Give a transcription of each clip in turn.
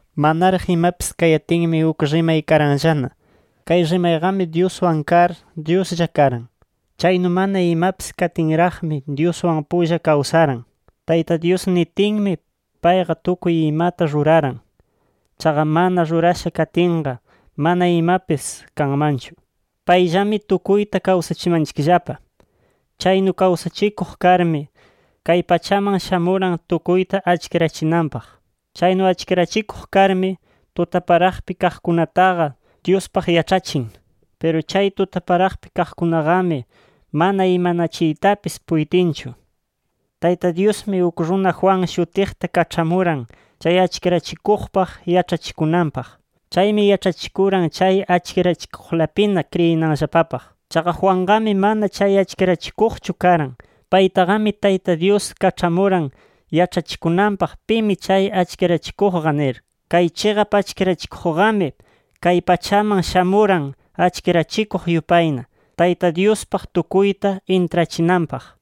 Manaraq imapis kayatinmi uk RIMAY karanllana. Kay RIMAYQAMI Dyuswan kar, Dyuslla karan. Chaynu mana imapis katinraqmi Dyuswan pulla kawsaran. Tayta Dyus nitinmi, payqa tukuy imata ruraran. Chaqa mana rurasha katinqa, mana imapis kanmanchu. Payllami tukuyta kawsachimanchikllapa. Chaynu kawsachikuq karmi, kay pachaman shamuran tukuyta achkirachinanpaq. Chaynu achkirachikuq karmi, tutaparaqpi kaqkunataqa Dyuspaq yaĉhachin. Piru chay tutaparaqpi kaqkunaqami mana imanachiytapis puytinchu. Tayta Dyusmi, uk runa Juan shutiqta kaĉhamuran chay achkirachikuqpaq yaĉhachikunanpaq. Chaymi yaĉhachikuran chay achkirachikuqlapina kriyinanllapapaq. Chaqa Juanqami mana chay achkirachikuqchu karan. Paytaqami Tayta Dyus kaĉhamuran yaĉhachikunanpaq pimi chay achkirachikuqqa nir. Kay chiqap achkirachikuqqami, kay pachaman shamuran achkirachikuq yupayna, Tayta Dyuspaq tukuyta intrachinanpaq.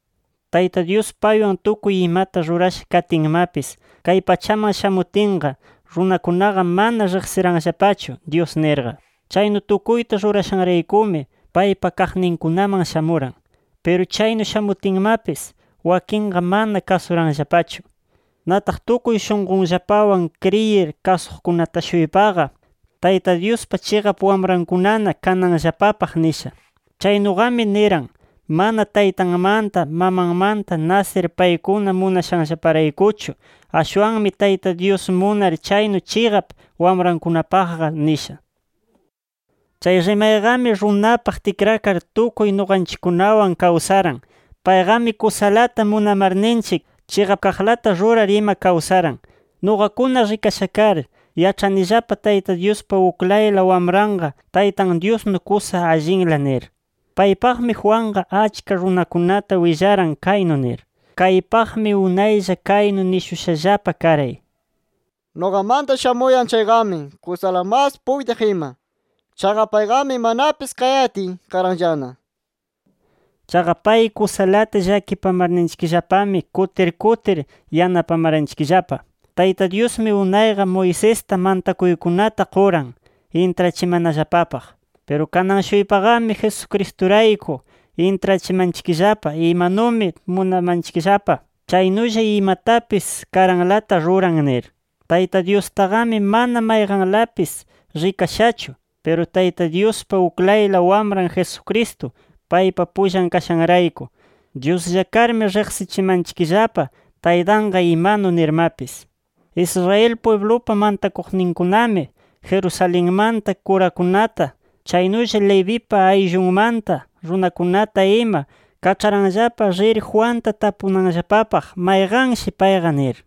Tayta Dyus paywan tukuy imata rurasha katinmapis, kay pachaman shamutinqa, runakunaqa mana riqsiranllapachu Dyus nirqa. Chaynu tukuyta rurashanraykumi, paypa kaqninkunaman shamuran. Piru chaynu shamutinmapis, wakinqa mana kasuranllapachu. Nataq tukuy shunqunllapawan kriyir kasuqkunata-shuypaqa, Tayta Dyuspa chiqap wamrankunana kananllapapaq nisha. Chaynuqami niran mana taytanmanta, mamanmanta nasir paykuna munashanllaparaykuchu. Ashwanmi Tayta Dyus munar chaynu chiqap wamrankunapaqqa nisha. Chay RIMAYQAMI runapaq tikrakar tukuy nuqanchikkunawan kawsaran. Payqami kusalata munamarninchik, chiqap kaqlata rurar ima kawsaran. Nuqakuna rikasha kar, yaĉhanillapa Tayta Dyuspa uklayla Wamranqa Taytan Dyusnu kusa allinla nir. Paypaqmi Juanqa achka runakunata willaran kaynu nir: “Kaypaqmi unaylla kaynu nishushallapa karay: ‘Nuqamanta shamuyan chayqami kusala mas puytiq ima. Chaqa payqami manapis kayatiy karanllana’ nir”. Chaqa pay kusalata llakipamarninchikllapami kutir kutir yanapamaranchikllapa. Tayta Dyusmi unayqa Moisesta mantakuykunata quran, intrachimanallapapaq. Piru kanan-shuypaqami Jesucristurayku intrachimanchikllapa imanumi munamanchikllapa, chaynulla imatapis karanlata ruran nir. Tayta Dyustaqami mana mayqanlapis rikashachu. Piru Tayta Dyuspa uklayla Wamran Jesucristo paypa pullan kashanrayku, Dyuslla karmi riqsichimanchikllapa Taytanqa imanu nirmapis. Israel pwiblupa mantakuqninkunami, Jerusalenmanta kurakunata chaynulla Levipa ayllumanta runakunata ima, kaĉharanllapa rir Juanta tapunanllapapaq mayqanshi payqa nir.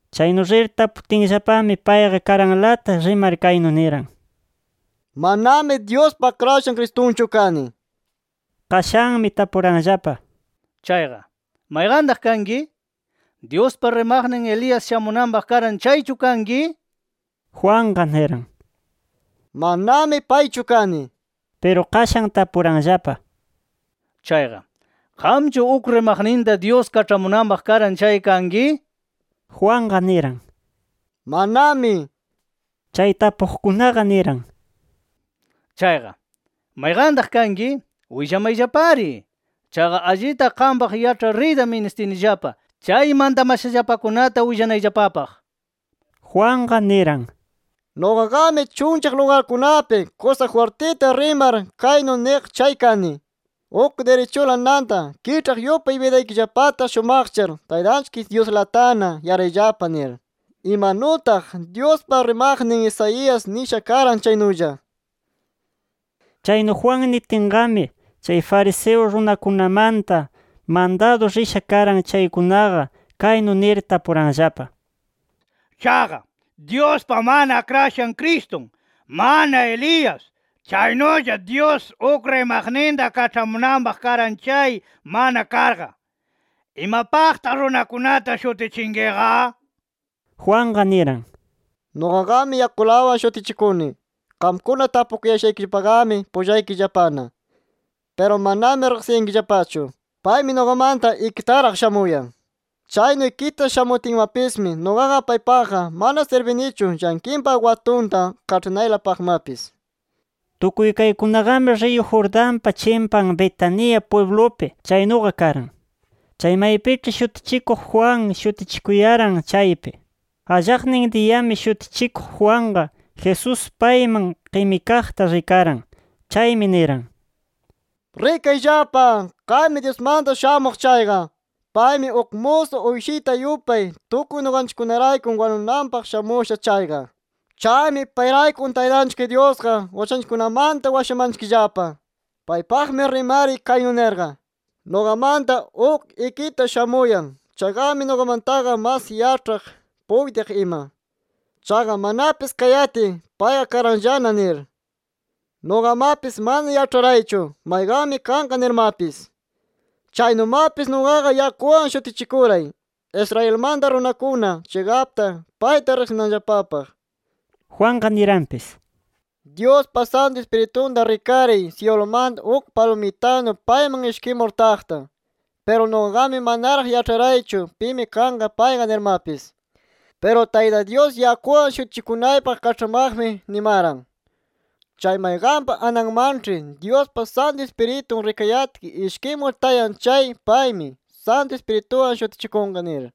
Chaynu rir taputinllapami payqa karanlata rimar kaynu niran: —Manami Dyuspa Akrashan Cristunchu kani nir. Qashanmi tapuranllapa: —Chayqa, ¿mayqantaq kanki? ¿Dyuspa rimaqnin Elías shamunanpaq karan, chaychu kanki? nir. Juanqa niran: —Manami paychu kani. Piru qashan tapuranllapa: —Chayqa, ¿qamchu uk rimaqninta Dyus kaĉhamunanpaq karan chay kanki? nir. Juanqa niran: —Manami nir. Chay tapuqkunaqa niran: —Chayqa, ¿mayqantaq kanki? Willamayllapari. Chaqa allita qampaq yaĉhar riyta ministinillapa chay mantamashallapakunata willanayllapapaq. Juanqa niran: —Nuqaqami chunllaq lugarkunapi kusa jwirtita rimar kaynu niq chay kani: ‘Uk dirichula nanta kiĉhaq yupay bidaykillapata shumaqchar, Taytanchik Dyuslatana yarayllapa’ nir, imanutaq Dyuspa rimaqnin Isaías nisha karan chaynulla. Chaynu Juan nitinqami, chay fariseo runakunamanta mandadu risha karan chaykunaqa, kaynu nir tapuranllapa: —Chaqa, Dyuspa mana Akrashan Cristun, mana Elías, chaynulla Dyus uk rimaqninta kaĉhamunanpaq karan chay mana karqa, ¿imapaqtaq runakunata shutichinkiqa? Juanqa niran: —Nuqaqami yakulawan shutichikuni. Qamkuna tapukuyashaykillapaqami pullaykillapana. Piru manami riqsiyankillapachu. Paymi nuqamanta ikitaraq shamuyan. Chaynu ikita shamutinmapismi nuqaqa paypaqqa mana sirbinichu llanqinpa watunta kaĉhanaylapaqmapis. Tukuy kaykunaqami riyu Jordanpa chimpan Betania pwiblupi chaynuqa karan, chay maypiĉhi Shutichikuq Juan shutichikuyaran chaypi. Allaqnin diyami Shutichikuq Juanqa, Jesús payman qimikaqta rikaran. Chaymi niran: “¡Rikayllapa kaymi Dyusmanta Shamuq chayqa! Paymi uk musu uyshita yupay, tukuy nuqanchikkunarayku wanunanpaq shamusha chayqa. Chaymi payrayku Taytanchik Dyusqa uchanchikkunamanta washamanchikllapa. Paypaqmi rimaray kaynu nirqa: ‘Nuqamanta uk ikita shamuyan. Chayqami, nuqamantaqa mas yaĉhaq, puytiq ima. Chaqa manapis kayatiy, payqa karanllana’ nir. Nuqamapis mana yaĉharaychu mayqanmi kanqa nirmapis. Chaynumapis nuqaqa yakuwan shutichikuray, Israelmanta runakuna chiqapta payta riqsinanllapapaq”. Juanqa niranpis: “Dyuspa Santu Ispiritunta rikaray, syilumanta uk palumitanu payman ishkimur taqta. Piru nuqaqami manaraq yaĉharaychu pimi kanqa payqa nirmapis. Piru Tayta Dyus yakuwan shutichikunaypaq kaĉhamaqmi, nimaran: ‘Chay mayqanpa ananmanĉhi Dyuspa Santu Ispiritun rikayatki ishkimur tayan chay paymi, Santu Ispirituwan shutichikunqa’ nir.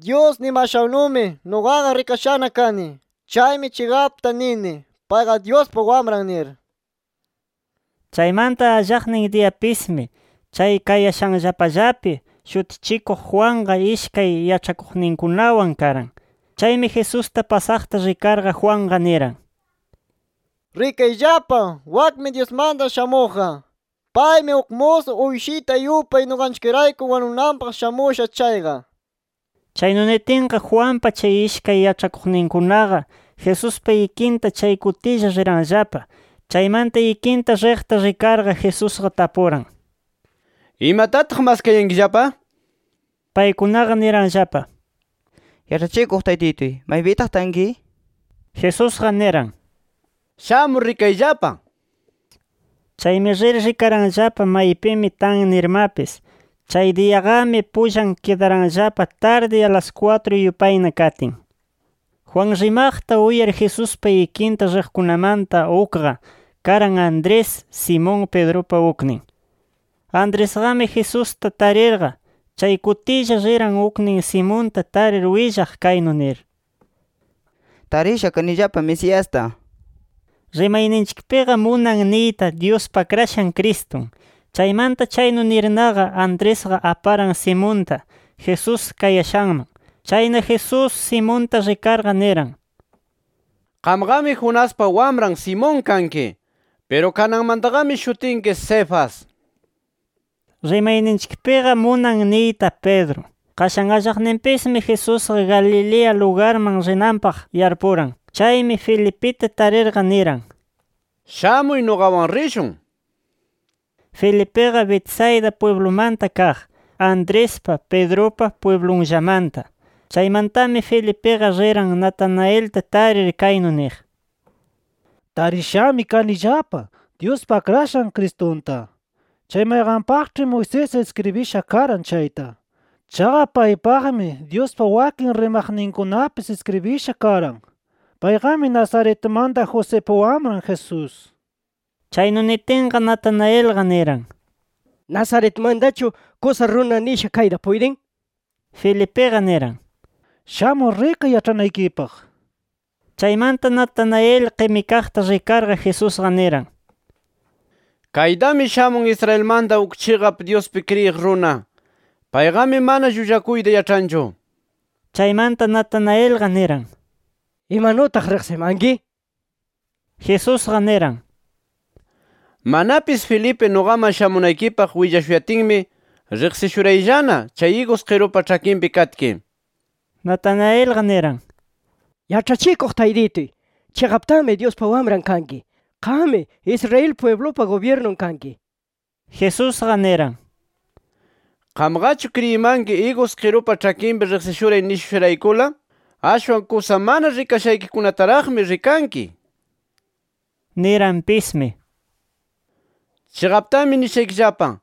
Dyus nimashannumi, nuqaqa rikashana kani. Chaymi chiqapta nini: Payqa Dyuspa Wamran nir”. Chaymanta allaqnin diyapismi, chay kayashanllapallapi Shutichikuq Juanqa ishkay yaĉhakuqninkunawan karan. Chaymi Jesusta pasaqta rikarqa, Juanqa niran: —Rikayllapa, wakmi Dyusmanta Shamuqqa. Paymi uk musu uyshita yupay nuqanchikrayku wanunanpaq shamusha chayqa. Chaynu nitinqa, Juanpa chay ishkay yaĉhakuqninkunaqa, Jesuspa ikinta chay kutilla riranllapa. Chaymanta, ikinta riqta rikarqa, Jesusqa tapuran: —¿Imatataq maskayankillapa? Paykunaqa niranllapa: —Yaĉhachikuq Taytituy, ¿maypitaq tanki? Jesusqa niran: —Shamur rikayllapa. Chaymi rir rikaranllapa maypimi tan nirmapis. Chay diyaqami, pullan kidaranllapa, tardi alas kwatru yupayna katin. Juan rimaqta uyar Jesuspa ikinta riqkunamanta ukqa, karan Andrés, Simón Pedrupa uknin. Andresqami Jesusta tarirqa, chay kutilla riran uknin Simonta tarir willaq kaynu nir: —Tarisha kanillapa Mesiasta. (Rimayninchikpiqa munan niyta Dyuspa Akrashan Cristun). Chaymanta chaynu nirnaqa, Andresqa aparan Simonta, Jesús kayashanman. Chayna Jesús, Simonta rikarqa niran: —Qamqami Jonaspa wamran Simón kanki. Piru kananmantaqami shutinki Cefas. (Rimayninchikpiqa munan niyta Pedro). Qashan allaqninpismi, Jesusqa Galilea lugarman rinanpaq yarpuran. Chaymi, Felipita tarirqa niran: —Shamuy nuqawan rishun nir. Felipiqa Betsaida pwiblumanta kaq, Andrespa, Pedrupa pwiblunllamanta. Chaymantami Felipiqa riran Natanaelta tarir, kaynu niq: —Tarishami kanillapa Dyuspa Akrashan Cristunta, chay mayqanpaqĉhi Moisés iskribisha karan chayta. Chaqa paypaqmi Dyuspa wakin rimaqninkunapis iskribisha karan. Payqami Nazaretmanta Josipa Wamran Jesús. Chaynu nitinqa, Natanaelqa niran: —¿Nazaretmantachu kusa runa nisha kayta puytin? Felipiqa niran: —Shamur rikay yaĉhanaykipaq. Chaymanta Natanael qimikaqta rikarqa, Jesusqa niran: —Kaytami shamun Israelmanta uk chiqap Dyuspi kriyiq runa. Payqami mana llullakuyta yaĉhanchu. Chaymanta, Natanaelqa niran: —¿Imanutaq riqsimanki? nir. Jesusqa niran: —Manapis Felipe nuqaman shamunaykipaq willashuyatinmi, riqsishuyarayllana, chay igus qirupa ĉhakinpi katki. Natanaelqa niran: —Yaĉhachikuq Taytituy, ¡chiqaptami Dyuspa Wamran kanki! ¡Qammi Israel pwiblupa gubyirnun kanki! nir. Jesusqa niran: —¿Qamqachu kriyimanki igus qirupa ĉhakinpi riqsishuray nishushayraykula? Ashwan kusa mana rikashaykikunataraqmi rikanki. Niranpismi: —Chiqaptami nishaykillapa: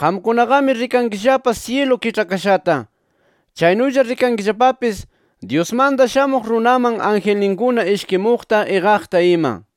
Qamkunaqami rikankillapa syilu kiĉhakashata. Chaynulla rikankillapapis, Dyusmanta Shamuq Runaman angelninkuna ishkimuqta, iqaqta ima.